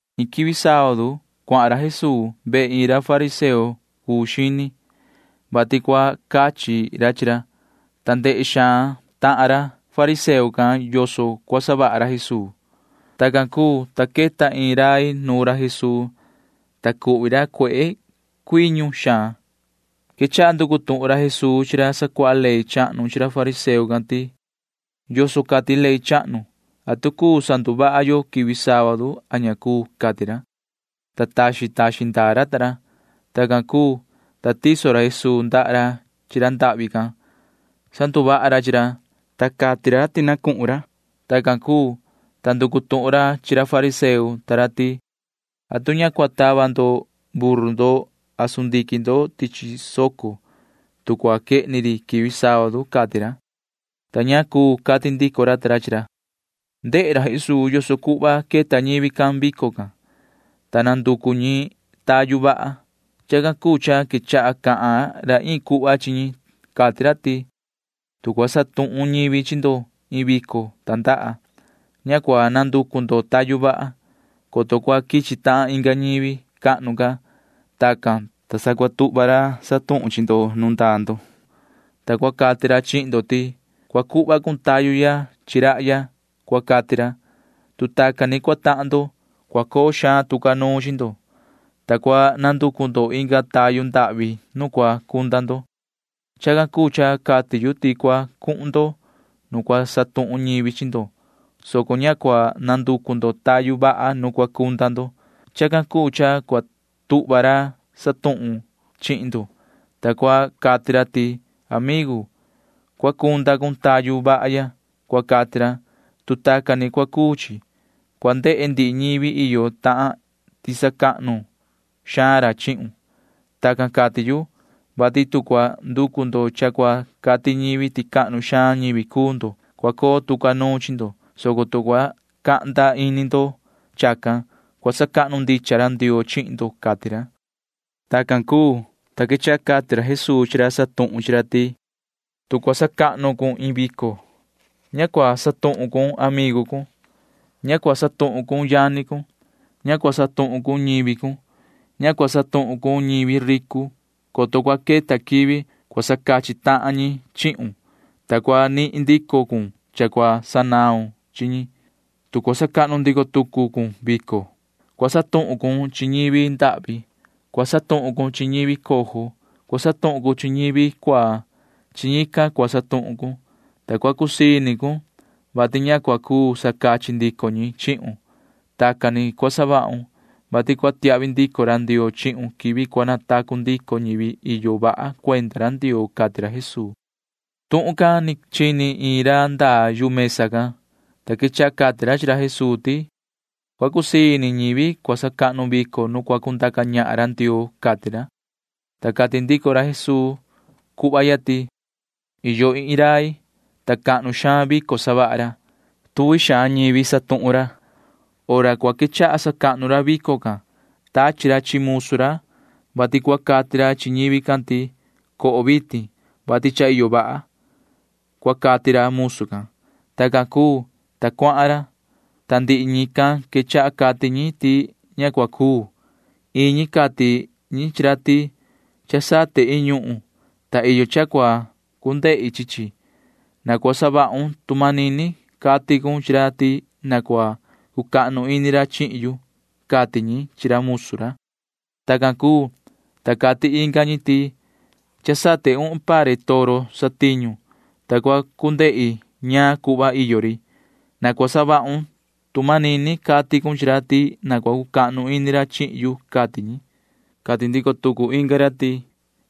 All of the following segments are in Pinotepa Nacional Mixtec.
Iin quivi sábadu cuahan ra Jesuu vehe iin ra fariseo cuu xini, vati cua cachi ra chi ra, ta ndehe xaan ra tahan ra fariseo can yoso cua savaha ra Jesuu. Tacan cuu, ta queta iin rai nuun ra Jesuu, ta cuhvi ra cuehe cuiñu xaan. Quechaha nducu tuhun ra Jesuu chi ra sacuaha ley chahnu chi ra fariseo can ti: ―¿Yoso cati ley chahnu? ¿Atu cuu sanduvaha yo quivi sábadu a ña cuu? ―cati ra. Ta taxin taxin ndaa ra ta ra. Tacan cuu, ta tiso ra Jesuu ndaha ra chi ra ndahvi can. Sanduvaha ra chi ra, ta chaha ra ti na cuhun ra. Tacan cuu, ta nducu tuhun ra chi ra fariseo ta ra ti: ―¿Atu ña cua tava ndo buru ndo a sundiquin ndo tichi soco, tu cua quehni ri quivi sábadu? ―cati ra. Ta ña cuu cati ndico ra ta ra chi ra. Ndehe ra Jesuu yoso cuhva queta ñivi can vico can, ta nanducu ñi tayu vaha. Chacan cuu cha quechaha cahan ra iin cuhva chi ñi. Cati ra ti: ―Tu cua satuhun ñivi chi ndo iin vico tandaha, ña cua nanducu ndo tayu vaha, coto cua quichi tahan inga ñivi cahnu ca. Tacan, ta sa cua tuhva ra cana chi ndo nu ndaa ndo, ta cua cati ra chihin ndo ti: “Cua cuhva cun tayu ya chi rahya,” cua cati ra. Tu tacan ni cua tahan ndo, cua coo xaan tu ca nuun chi ndo, ta cua nanducu ndo inga tayu ndahvi nu cua cunda ndo. Chacan cuu cha cati yu ti cua cuhun ndo nu cua satuhun ñivi chi ndo, soco ña cua nanducu ndo tayu vaha nu cua cunda ndo. Chacan cuu cha cua tuhva ra cana chihin ndo, ta cua cati ra ti: “Amigu, cua cunda cun tayu vaha ya,” cua cati ra. Tu tacan ni cua cuu chi, cua ndehe ndihi ñivi iyo tahan ti sacahnu xaan ra chihun. Tacan cati yu, vati tu cua nducu ndo cha cua cati ñivi ti cahnu xaan ñivi cuu ndo, cua coo tu ca nuun chi ndo, soco tu cua cahnda ini ndo chacan, cua sacahnu ndicha ra Ndioo chihin ndo ―cati ra. Tacan cuu, ta quechaha cati ra Jesuu chi ra cana ñahan chi ra ti: ―Tu cua sacahnu cun iin vico, ña cua satuhun cun amigu cun. Ña cua satuhun cun yani cun. Ña cua satuhun cun ñivi cun. Ña cua satuhun cun ñivi ricu, coto cua queta quivi cua sacachi tahan ñi chihun, ta cua nihin ndico cun cha cua sanaun chi ñi. Tu cua sacahnu ndico tucu cun vico, cua satuhun cun chi ñivi ndahvi. Cua satuhun cun chi ñivi cojo. Cua satuhun cun chi ñivi cuaa. Chi ñican cua satuhun cun, ta cua cusii ini cun, vati ña cua cuu sacachi ndico ñi chihun. Tacan ni cua savahun, vati cua tiahvi ndico ra Ndioo chihun quivi cua natacu ndico ñivi iyo vaha cuenda ra Ndioo ―cati ra Jesuu. Tuhun can ni chini iin ra ndaa yu mesa can, ta quechaha cati ra chi ra Jesuu ti: ―Cua cusii ini ñivi cua sacahnu vico nu cua cundaca ñahan ra Ndioo ―cati ra. Ta cati ndico ra Jesuu cuhva ya ti: ―Iyo iin rai, ta cahnu xaan vico savaha ra. Tuvi xaan ñivi cana ñahan ra. Hora cua quechaha sacahnu ra vico can tachi ra chi musu ra, vati cua cati ra chi ñivi can ti: “Coho vitin, vati cha iyo vaha,” cua cati ra musu can. Tacan cuu, ta cuahan ra, ta ndihi ñican quechaha cati ñi ti ña cua cuu. Iin ñi cati ñi chi ra ti: “Cha sate iin ñuhun, ta iyo cha cua cu ndehi chi chi. Na cua savahun tu manini cati cun chi ra ti na cua cucahnu ini ra chihin yu,” cati ñi chi ra musu ra. Tacan cuu, ta cati inga ñi ti: “Cha sate uhun pare toro satiñu, ta cua cu ndehi ñaan cuhva iyo ri. Na cua savahun tu manini cati cun chi ra ti na cua cucahnu ini ra chihin yu,” cati ñi. Cati ndico tucu inga ra ti: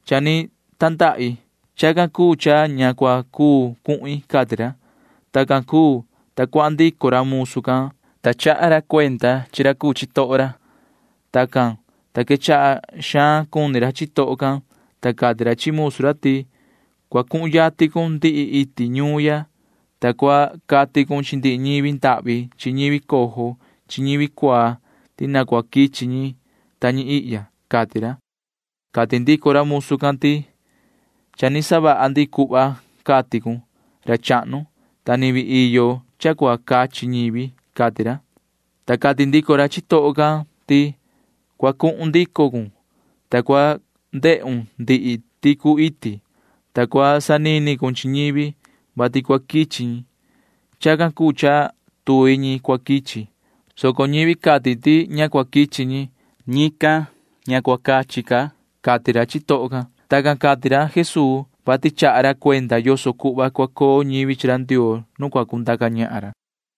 “Cha ni tandahi. Chacan cuu cha ña cua cuu cuhin,” cati ra. Tacan cuu, ta cuahan ndico ra musu can, ta chaha ra cuenda chi ra cuu chitoho ra. Tacan, ta quechaha xaan cuni ra chitoho can, ta cati ra chi musu ra ti: “Cua cuhun yatin cun ndihi iti ñuun ya, ta cua cati cun chi ndihi ñivi ndahvi chi ñivi cojo chi ñivi cuaa ti na cua quichi ñi ta ñi ihya,” cati ra. Cati ndico ra musu can ti: “Cha ni savaha ndi cuhva cati cun, ra chahnu, ta ni vii iyo cha cua cachi ñivi,” cati ra, ta cati ndico ra chitoho can ti: “Cua cuhun ndico cun, ta cua ndehun ndihi ticu iti, ta cua sanini cun chi ñivi, vati cua quichi ñi. Chacan cuu cha tuvi ñi cua quichi, soco ñivi cati ti ña quichi ñi―ñican ña cua cachi ca ñi chihin yu,” cati ra chitoho can. [Tacan cati ra Jesuu, vati chaha ra cuenda yoso cuhva cua coo ñivi chi ra Ndioo nu cua cundaca ñahan ra.]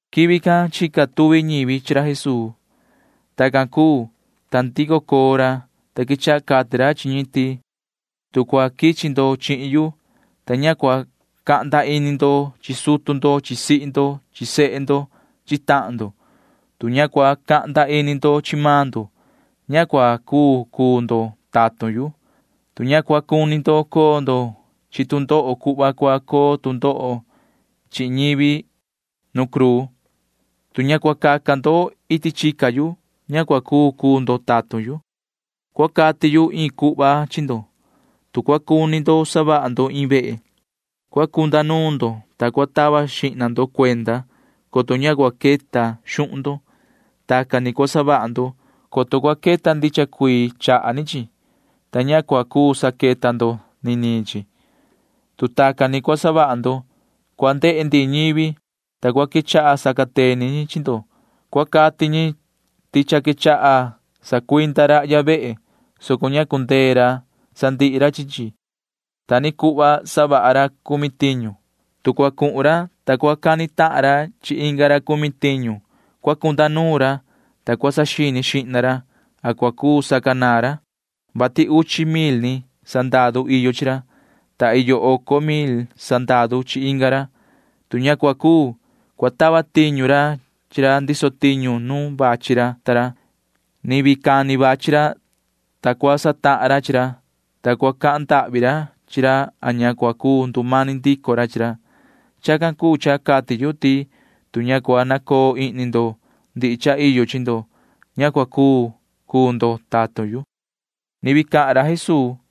Quivi can chica tuvi ñivi chi ra Jesuu. Tacan cuu, ta ndico coo ra, ta quechaha cati ra chi ñi ti: ―Tu cua quichi ndo chihin yu, ta ña cua cahnda ini ndo chi sutu ndo chi sihi ndo chi sehe ndo chi tahan ndo, tu ña cua cahnda ini ndo chi maan ndo, ña cua cuu cuu ndo tatun yu. Tu ña cua cuni ndo coo ndo chi tu ndoho cuhva cua coo tu ndoho chihin ñivi nu cruu, tu ña cua caca ndo iti chica yu, ña cua cuu cuu ndo tatun yu. [Cua cati yu iin cuhva chi ndo.] Tu cua cuni ndo savaha ndo iin vehe, cua cunda nuun ndo, ta cua tava xihna ndo cuenda, coto ña cua queta xuhun ndo. Tacan ni cua savaha ndo, coto cua queta ndicha cuii chaha ni chi, ta ña cua cuu saqueta ndo niniin chi. Tu tacan ni cua savaha ndo, cua ndehe ndihi ñivi, ta cua quechaha sacateni ñi chi ndo. Cua cati ñi ti cha quechaha sacuinda rahya vehe, soco ña cundee ra sandihi ra chi chi. Ta ni cuhva savaha ra cumi tiñu. Tu cua cuhun ra, ta cua cani tahan ra chi inga ra cumi tiñu, cua cunda nuun ra, ta cua saxini xihna ra a cua cuu sacanaan ra, vati uchi mil ni sandaru iyo chi ra, ta iyo oco mil sandaru chi inga ra. Tu ña cua cuu, cua tava tiñu ra chi ra ndiso tiñu nu vachi ra ta ra. Ni vii cani vachi ra, ta cua satahan ra chi ra, ta cua cahan ndahvi ra chi ra a ña cua cuu ndumani ndico ra chi ra. Chacan cuu cha cati yu ti tu ña cua nacoo ihni ndo ndihi cha iyo chi ndo, ña cua cuu cuu ndo tatun yu. [Ni vii cahan ra Jesuu:]